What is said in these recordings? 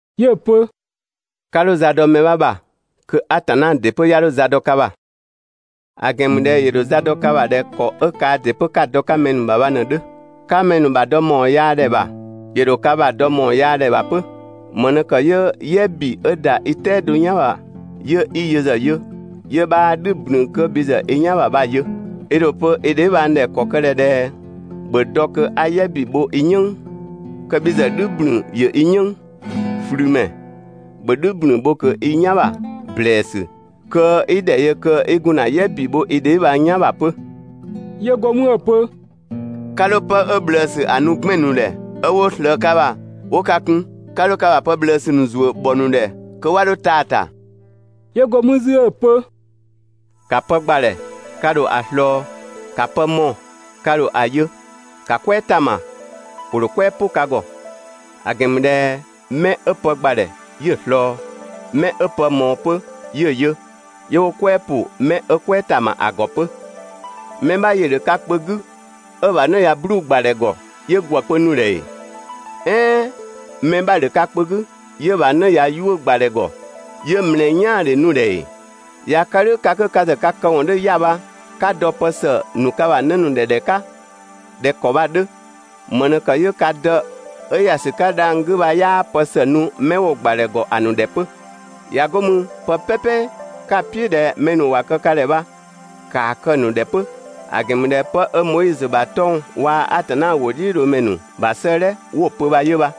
'Yö‑ pö: «'Ka 'dho za dɔ mɛ 'bha ‑bha, kö Atanna ‑dɩ 'pö 'ya 'dho za dɔ ka ‑bha. ‑A ‑gɛn ‑mü ꞊dhɛ ‑yö ‑dho za dɔ ka ‑bha ꞊dhɛ ‑kɔ 'ö kaa ‑dɩ 'pö 'ka‑ dɔ‑ 'ka mɛ ‑nu ‑bha bha ꞊në‑ 'dhö; 'ka mɛ ‑nu ‑bha dɔ ‑mawɔn yaa ‑dhɛ ‑bha, ‑yö ‑dho ka ‑bha dɔ ‑mawɔn yaa ‑dhɛ ‑bha 'pö. ‑Më ꞊në ‑kë 'yö "yɛ ‑bi 'ö ‑da i "tɛado "yan ‑bha 'yö 'i yö ‑zë yö, 'yö 'bhaa "dhü ‑blün kö bhi ‑zë i "yan ‑bha bha‑ yö. I ‑dho pö i dheebhang ‑dhɛ ‑kɔ kë ꞊dhɛ ꞊dhɛ ‹‑bhö dɔ kö 'a "yɛ ‑bi bho i "yënng› kö bhi ‑zë "dhü ‑blün ‑yö i "yënng? ꞊Flümɛ, ‑bhö "dhü ‑blün bho ꞊kö i "yan ‑bha ‑blɛɛsü kö i ‑dhɛ yö kö 'i gun ‑na "yɛ ‑bi bho i dheebhang "yan ‑bha 'pö!» 'Yö go mü 'ö‑ pö: «'Ka 'dho 'pë 'ö ꞊bhlëësü ‑a nu 'gbɛn‑ ‑nu ‑dhɛ, 'ö 'wo ꞊slëë ka ‑bha 'wo ka kun. 'Ka 'dho ka ‑bha pë ꞊bhlëësü ‑nu ‑zuö ‑bhɔ ‑nu ‑dhɛ kö 'wa 'dho taa‑ ‑ta.» 'Yö go mü 'zü 'ö‑ pö: «‑Ka pë ‑gbadhɛ, ka ‑dho ‑a ꞊slɔɔ! ‑Ka pë mɔɔ‑, ka ‑dho ‑a yö! ‑Ka "kwɛɛ ‑ta ‑ma, ‑wo ‑dho "kwɛɛ "pʋ ka ‑gɔ. ‑A ‑gɛn ‑mü ꞊dhɛ mɛ 'ö pë ‑gbadhɛ 'yö‑ ꞊slɔɔ, 'mɛ 'ö pë ꞊mɔɔ 'pö 'yö‑ yö, 'yö 'wo "kwɛɛ ‑pʋ 'mɛ 'ö "kwɛɛ ‑ta ‑ma ‑a ‑gɔ 'pö. Mɛ 'bha ‑yö ‑dhö ka kpö 'gü 'ö‑ ‑bha 'në ꞊ya 'bluu‑ ‑gbadhɛ ‑gɔ, 'yö ‑gwë kpö nu‑ ‑dhɛ ‑ee? "Ɛɛn mɛ 'bha‑ ‑dhö ka kpö 'gü 'yö‑ ‑bha 'në ꞊ya 'yuʋ̈‑ ‑gbadhɛ ‑gɔ, 'yö ‑mlɛɛ "yaandhe nu‑ ‑dhɛ ‑ee? ꞊Ya kë "dhʋ̈ ka 'ö ka ‑zë ka këwɔn 'dhö 'ya‑ bha, 'ka dɔ pë ‑së ‑nu ka ‑bha 'në ‑nu ‑dhɛ ‑dhɛ 'ka ꞊dhɛ ‑kɔ bha‑ 'dhö, ‑më ꞊në ‑kë 'yö ka Dë 'ö ‑ya ‑sü 'ka dhang‑ 'gü bha 'yaa pë ‑së nu 'mɛ 'wo‑ ‑gbadhɛ ‑gɔ ‑a ‑nu ‑dhɛ 'pö? ꞊Ya 'go mü pë "pɛpɛ 'ka‑ "piʋ̈ ꞊dhɛ mɛ ‑nu ‑wa kë ka ‑dhɛ bha, ‑kaa kë‑ ‑nu ‑dhɛ 'pö, ‑a ‑gɛn ‑mü ꞊dhɛ 'pë 'ö Moizö ‑bha 'tɔng‑ waa‑ Atanna ‑wʋdhiʋ̈loomɛ ‑nu ‑bha 'sëëdhɛ 'wo‑ pö bha 'yö bha.»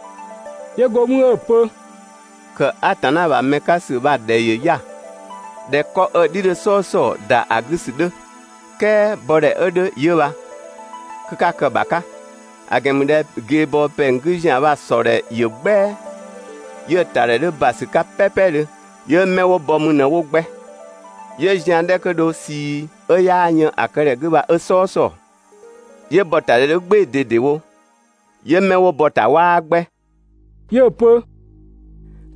'Yö go mü 'ö‑ pö: «‑Kë Atanna ‑bha mɛ 'ka ‑sü bha‑ ‑dhɛ ‑yö 'ya‑ ꞊dhɛ 'kɔ 'ö‑ "dhi 'dhö "sɔɔsɔɔ, ‑da ‑a 'gü ‑sü 'dhö, "kɛɛ bɔdhɛ 'ö 'dhö 'yö bha, kö 'ka kë‑ ‑bha 'ka! ‑A ‑gɛn ‑mü ꞊dhɛ ꞊geebɔɔ ‑pɛng 'gü ‑zian bha‑ ‑sɔ ‑dhɛ ‑yö "gbɛa, 'yö‑ ‑tadhɛ 'dhö ‑basü 'ka "pɛpɛdhö, 'yö 'mɛ 'wo bɔ mü ꞊në 'wo 'gbɛ. 'Yö zian 'dhɛ kö dho ꞊sii 'ö 'yaa yën ‑a këdhɛ 'gü bha 'ö "sɔɔsɔɔ, 'yö ‑bɔ ‑ta ‑dhɛ 'dhö "gbɩɩ‑ ꞊dedewo, 'yö mɛ 'wo bɔ‑ ‑ta 'waa 'gbɛ.» 'Yö‑ pö: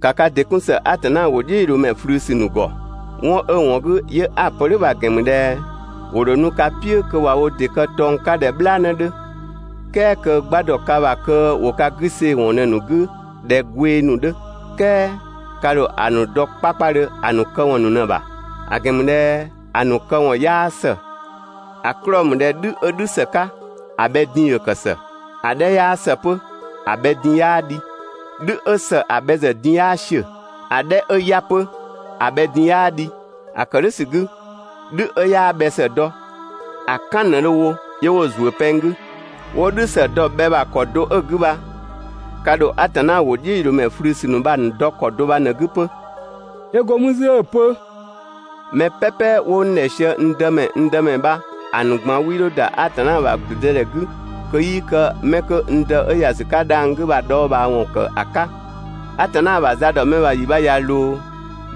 «‑Ka ka ‑dɩ 'kun ‑së Atanna ‑wʋdhiʋ̈loomɛ ꞊flüsü ‑nu ‑gɔ! 'Wɔn 'ö‑ ‑wɔn 'gü, 'yö 'a‑ pö "dhʋ̈ bha‑ ‑gɛn ‑mü ꞊dhɛ: ‑Wo ‑dho nu ka "piʋ̈ kö ꞊wa wo tɔng 'ka ꞊dhɛ "bhlaanë 'dhö, "kɛɛ kö 'gba ‑dɔ ka ‑bha kö 'wo ka 'gü see‑ ‑wɔn ꞊në‑ ‑nu 'gü ꞊dhɛ gwee ‑nu 'dhö. "Kɛɛ ka ‑dho ‑a ‑nu dɔ 'kpakpadhö ‑a ‑nu këwɔn ‑nu ꞊në‑ ‑bha; ‑a ‑gɛn ‑mü ꞊dhɛ ‑a ‑nu këwɔn 'yaa ‑së ‑A 'klɔɔ‑ ‑mü ꞊dhɛ "dhü 'ö "dhü ‑së 'ka ‑a bhɛ din ‑yö ‑kë ‑së; ‑a 'dhɛ 'yaa ‑së 'pö, ‑a bhɛ din 'yaa dhi. "Dhü 'ö ‑së ‑a bhɛ ‑zë din 'yaa ‑siö, ‑a 'dhɛ 'ö 'ya‑ 'pö, ‑a bhɛ din 'yaa dhi. ‑A ‑kë "dhʋ̈ ‑sü 'gü, "dhü 'ö 'yaa bhɛ ‑së dɔ, ‑a "kan ꞊në 'wo dho‑ wo 'yö 'wo‑ ‑zuö pɛng 'gü. 'Wo "dhü ‑së dɔ‑ bhɛ ‑bha ‑kɔ do 'ö‑ 'gü bha, ka ‑dho Atanna ‑wʋdhiʋ̈loomɛ ꞊flüsü ‑nu bha‑ ‑nu dɔ ‑kɔ do bha ꞊në‑ 'gü 'pö.» 'Yö go mü 'zü 'ö‑ pö: «Mɛ "pɛpɛ 'wo n ‑dhɛ sië ‹n Dëmɛ, n Dëmɛ› bha, ‑a ‑nu ꞊gban 'wii 'dho ‑da Atanna ‑bha ‑gblüdëdhɛ 'gü kö 'yii kë mɛ 'kö n Dë 'ö ‑ya ‑sü 'ka dhang‑ 'gü bha‑ dhɔɔbhaawɔn ‑kë ‑a 'ka. Atanna ‑bha za ‑dɔ mɛ ‑bha yi bha ꞊ya ꞊loo,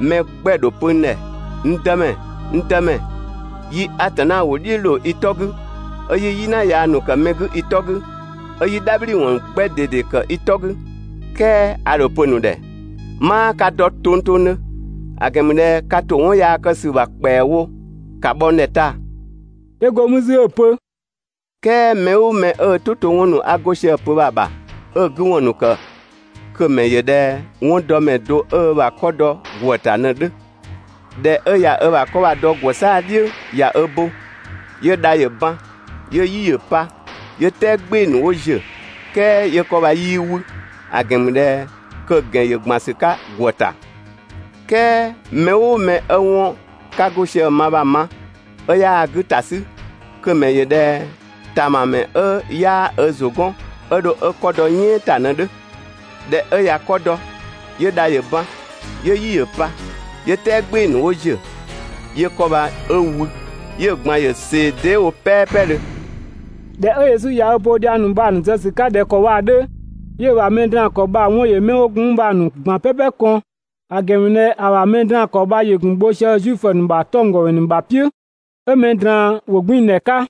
mɛ 'gbɛ‑ ‑dho pö n ‑dhɛ: ‹N Dëmɛ, n Dëmɛ, yi Atanna ‑wʋ "dhiʋ̈ ꞊loo i 'tɔ 'gü, 'ö 'yi "yina yaa ‑nu kë mɛ ‑nu 'gü i 'tɔ 'gü, 'ö 'yi "dhabhliwɔn 'gbɛ ꞊dede ‑kë i 'tɔ 'gü› "kɛɛ ‑a ‑dho pö‑ ‑nu ‑dhɛ: 'Maa ka dɔ tongtongdhö, ‑a ‑gɛn ‑mü ꞊dhɛ ka ‑to 'wɔn yaa kë ‑sü ‑bha ‑kpɛawo, ‑ka bhɔ n ‑dhɛ taa‑!» 'Yö go mü 'zü 'ö‑ pö: «"Kɛɛ mɛ "ʋʋ mɛ 'ö ö "tʋ to 'wɔn ‑nu 'a go sië‑ pö bha‑ ‑bha, 'ö‑ 'gü ‑wɔn ‑nu ‑kë kö‑ ‑mɛ ‑yö ꞊dhɛ 'wɔndɔmɛ do 'ö ö ‑bha 'kɔ dɔ ‑gwë ‑ta ꞊në‑ 'dhö. ꞊Dhɛ 'ö ꞊ya ö ‑bha 'kɔ bha‑ ‑dɔ ‑gwë 'saa‑ "dhiʋ̈ ꞊ya ö bo, 'yö dha ‑yö ban, 'yö "yi ‑yö pa, 'yö "tɛɛ "gbɩɩ‑ ‑nu 'wo ‑ziö, "kɛɛ 'yö 'kɔ bha 'yii 'wü, ‑a ‑gɛn ‑mü ꞊dhɛ kö‑ ‑gɛn ‑yö ‑gban ‑sü 'ka ‑gwë ‑ta. "Kɛɛ mɛ "ʋʋ mɛ 'ö 'wɔn 'ka 'go sië‑ ma bha‑ ma, 'ö 'yaa‑ 'gü ‑ta 'sü, kö‑ ‑mɛ ‑yö ꞊dhɛ ‑tamamɛ 'ö 'yaa ö ‑zʋ 'gɔn 'ö dho 'ö 'kɔ dɔ "yɛɛn ‑ta ꞊në‑ 'dhö. ꞊Dhɛ 'ö ꞊ya 'kɔ dɔ, 'yö dha ‑yö ban, 'yö "yi ‑yö pa, 'yö "tɛɛ "gbɩɩ‑ ‑nu 'wo ‑ziö, 'yö 'kɔ bha 'ö wü, 'yö‑ ꞊gban ‑yö ꞊see dee" wo "pɛɛpɛdhö.» ꞊Dhɛ 'ö Yesu ꞊ya ö bo dhiang ‑nu bha‑ ‑nu zë ‑sü 'ka ꞊dhɛ ‑kɔ bha‑ 'dhö, 'yö‑ ‑bha mɛ draan‑ ‑kɔ bha‑ 'wɔn ‑yö mɛ 'wo gun mü bha‑ ‑nu ꞊gban "pɛpɛ kɔn; ‑a ‑gɛn ‑mü ꞊dhɛ ‑a ‑bha mɛ draan‑ ‑kɔ bha ‑yö ‑gun bho sië Zuifö ‑nu ‑bha 'tɔnggɔmɛ ‑nu ‑bha "piʋ̈, 'ö mɛ ꞊draan ‑wʋgbiindhɛ 'ka.»